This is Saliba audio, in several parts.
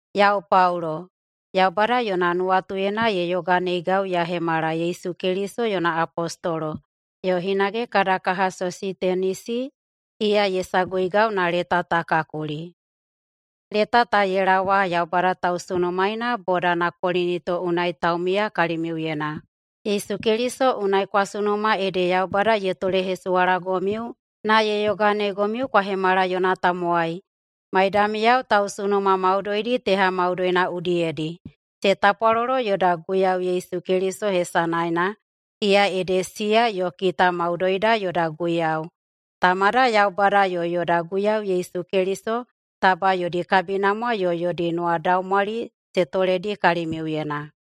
Yau Paulo, Yaubada yona nuwatuyena ye yoganeigau ya hemala Yesu Keliso yona apostolo, yo hinage kada kaha Sositenisi, iya ye saguigau na leta ta ka kuli. Leta ta ye laowa Yaubada tausunumaena bodana Kolinito unai taumiya kalimiuyena. Yesu Keliso unai kwa sunuma ede Yaubada ye tolehesuwalagomiu na ye yoganeigomiu kwa hemala yona tamowai, maidamiyao tausunuma maudoidi teha maudoina udiyedi. Se tapwalolo yoda Guiyau Yesu Keliso hesanaena, iya ede siya yo kita maudoida yoda Guiyau. Tamada Yaubada yo yoda Guiyau Yesu Keliso taba yodi kabinamwa yo yodi nuwadaumwali se toledi kalimiuyena.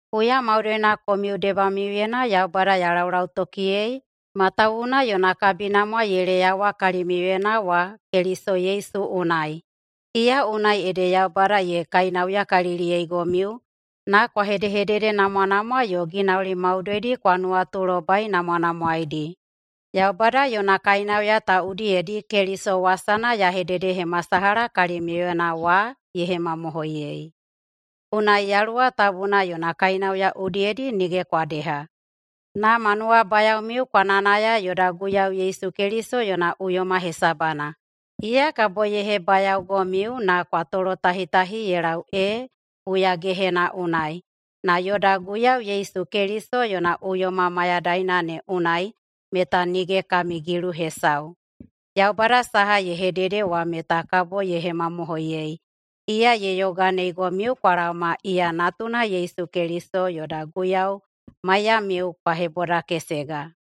Huya maudoina komiu debamiuyena Yaubada ya laulautokiyei matawuwuna yona kabinamwa ye leyawa kalimiuyena wa Keliso Yesu unai. Iya unai ede Yaubada ye kainauyakaliliyeigomiu na kwa hedehededenamwanamwa yo ginauli maudoidi kwa nuwatulobainamwanamwaeidi. Yaubada yona kainauya ta udiyedi Keliso wasana ya hededehemasalaha kalimiuyena wa ye hemamohoiyei. Unai Yaluwa Tabuna yona kainauya udiyedi nige kwa deha, na ma nuwabayaomiu kwa nayanaya yoda Guiyau Yesu Keliso yona uyoma hesabana. Iya kabo ye hebayaogomiu na kwa tolotahitahi ye lau ee huyagehena unai, na yoda Guiyau Yesu Keliso yona uyoma mayadaina ne unai meta nige kami gilu hesau. Yaubada saha ye hedede wa meta kabo ye hemamohoiyei. Iya ye yoganeigomiu kwa laoma iya natuna Yesu Keliso yoda Guiyau maiyamiu kwa hebodakesega.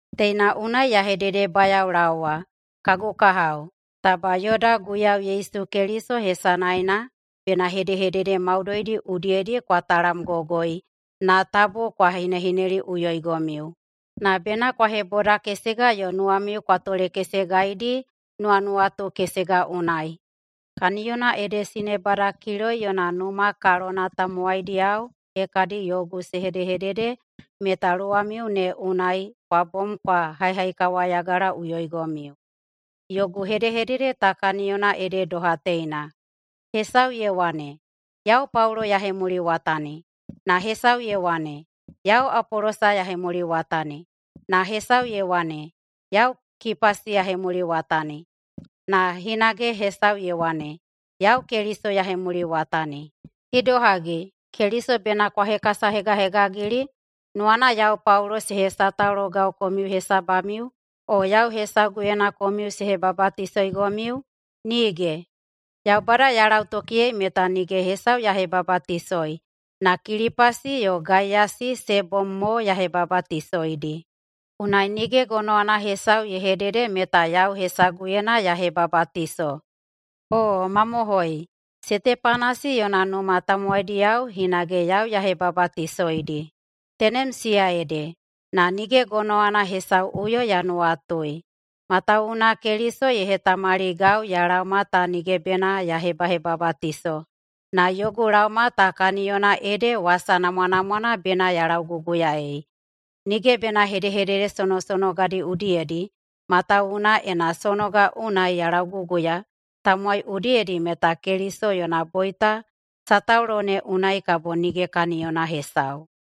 Teina unai ya hededebayaolaowa, kagu kahao, taba yoda Guiyau Yesu Keliso hesanaena bena hedehedede maudoidi udiyedi kwa talamgogoi na tabu kwa hinehineliꞌuyoigomiu, na bena kwa hebodakesega yo nuwamiu kwa tolekesegaidi nuwanuwatu kesega unai. Kaniyona ede sinebada Kiloi yona numa kalona tamowaidiyao hekadi yogu se hedehedede meta luwamiu ne unai kwa bom kwa haihaikawayagalaꞌuyoigomiu. Yogu hedehedede ta kaniyona ede doha teina: Hesau ye wane, “Yau Paulo ya hemuliwatani,” na hesau ye wane, “Yau Apolosa ya hemuliwatani,” na hesau ye wane, “Yau Kipasi ya hemuliwatani,” na hinage hesau ye wane, “Yau Keliso ya hemuliwatani.” Idohagi, Keliso bena kwa hekasahegahegagili? Nuwana yau Paulo se hesataulogau komiu hesabamiu? O yau hesaguyena komiu se hebabatisoigomiu? Nige! Yaubada ya lautokiyei meta nige hesau ya hebabatisoi, na Kilipasi yo Gaiyasi se bom mo ya hebabatisoidi. Unai nige gonowana hesau ye hedede meta yau hesaguyena ya hebabatiso. Oo mamohoi, Setepanasi yona numa tamowaidiyao hinage yau ya hebabatisoidi. Tenem siya ede, na nige gonowana hesauꞌuyo ya nuwatui. Matawuwuna Keliso ye hetamaligau ya laoma ta nige bena ya hebahebabatiso, na yogu laoma ta kaniyona ede wasa namwanamwana bena ya lauguguyaei. Nige bena hedehedede sonosonogadi udiyedi, matawuwuna ena sonoga unai ya lauguguya tamowai udiyedi meta Keliso yona boita sataulo ne unai kabo nige kaniyona hesau.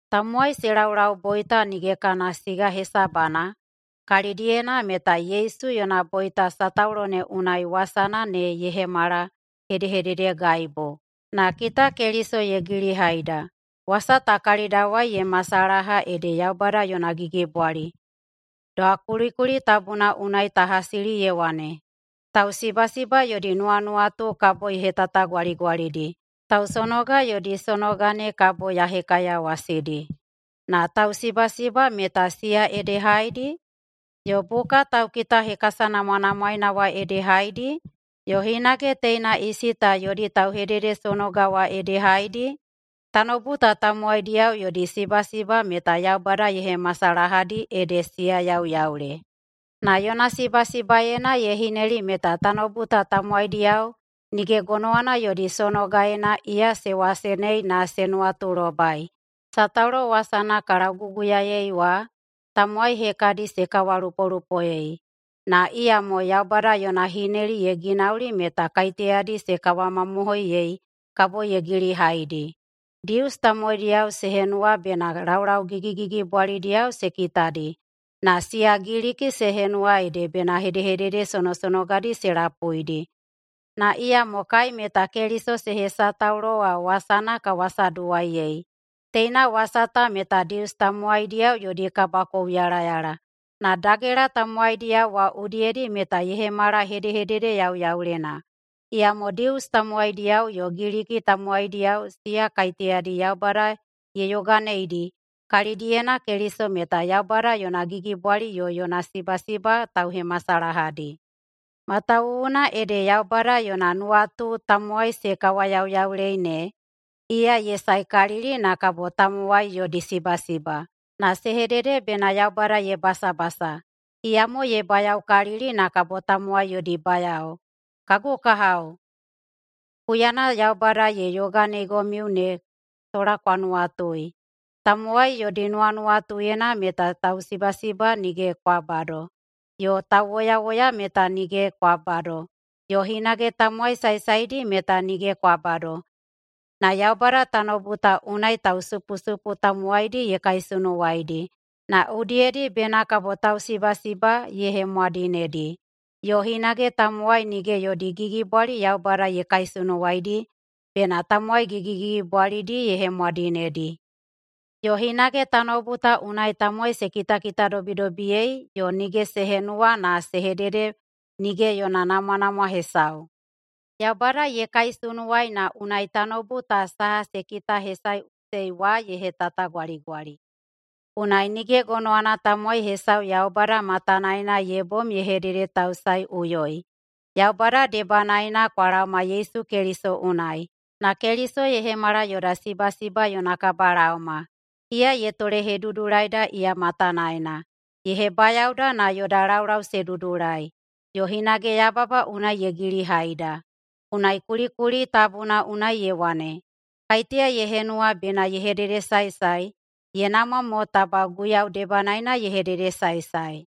Tamowai se laulau boita nige kana siga hesabana, kalidiyena meta Yesu yona boita sataulo ne unai wasana ne ye hemala hedehededegaibu. Na kita Keliso ye gilihaida, wasa ta kalidawai ye masalaha ede Yaubada yona gigibwali. Doha kulikuli tabuna unai ta hasili ye wane, “Tausibasiba yodi nuwanuwatu kabo ya hetatagwaligwalidi, tausonoga yodi sonoga ne kabo ya hekaiyawasidi.” Na tausibasiba meta siya ede haedi? Yo buka taukitahekasanamwanamwaena wa ede haedi? Yo hinage teina isi ta yodi tauhededesonoga wa ede haedi? Tanoubu ta tamowaidiyao yodi sibasiba meta Yaubada ye hemasalahadi ede siya yauyaule. Na yona sibasibaena ye hineli meta tanoubu ta tamowaidiyao nige gonowana yodi sonogaena iya se wasenei na se nuwatulobai. Sataulo wasana ka lauguguyaei wa, tamowai hekadi se kawalupolupoei. Na iyamo Yaubada yona hineli ye ginauli meta kaiteyadi se kawamamohoiyei kabo ye gilihaidi. Dius tamowaidiyao se henuwa bena laulau gigigigibwalidiyao se kitadi, na siya Giliki se henuwa ede bena hedehedede sonosonogadi se lapuidi. Na iyamo kai meta Keliso se hesataulo wa wasana ka wasaduwaiyei. Teina wasa ta meta Dius tamowaidiyao yodi kabakouyalayala, na dagela tamowaidiyao wa udiyedi meta ye hemala hedehedede yauyaulena. Iyamo Dius tamowaidiyao yo Giliki tamowaidiyao siya kaiteyadi Yaubada ye yoganeidi, kalidiyena Keliso meta Yaubada yona gigibwali yo yona sibasiba tauhemasalahadi. Matawuwuna ede Yaubada yona nuwatu tamowai se kawayauyaulei ne, iya ye saekalili na kabo tamowai yodi sibasiba, na se hedede bena Yaubada ye basabasa, iyamo ye bayaokalili na kabo tamowai yodi bayao. Kagu kahao, huyana Yaubada ye yoganeigomiu ne sola kwa nuwatui. Tamowai yodi nuwanuwatuyena meta tausibasiba nige kwa bado, yo tauwoyawoya meta nige kwa bado, yo hinage tamowai saesaedi meta nige kwa bado. Na Yaubada tanoubu ta unai tausupusupu tamowaidi ye kaisunuwaidi, na udiyedi bena kabo tausibasiba ye hemwadinedi, yo hinage tamowai nige yodi gigibwali Yaubada ye kaisunuwaidi, bena tamowai gigigigibwalidi ye hemwadinedi. Yo hinage tanoubu ta unai tamowai se kitakitadobidobiyei yo nige se henuwa na se hedede nige yona namwanamwa hesau, Yaubada ye kaisunuwai na unai tanoubu ta saha se kitahesaeꞌusei wa ye hetatagwaligwali. Unai nige gonowana tamowai hesau Yaubada matanaena ye bom ye hededetausaeiꞌuyoi. Yaubada debanaena kwa laoma Yesu Keliso unai, na Keliso ye hemala yoda sibasiba yona kabalaoma. Iya ye tolehedudulaida iya matanaena, ye hebayaoda na yoda laulau se dudulai, yo hinage yababa unai ye gilihaida. Unai kulikuli tabuna unai ye wane, “Kaiteya ye henuwa bena ye hededesaesae, ye namwa mo taba Guiyau debanaena ye hededesaesae.”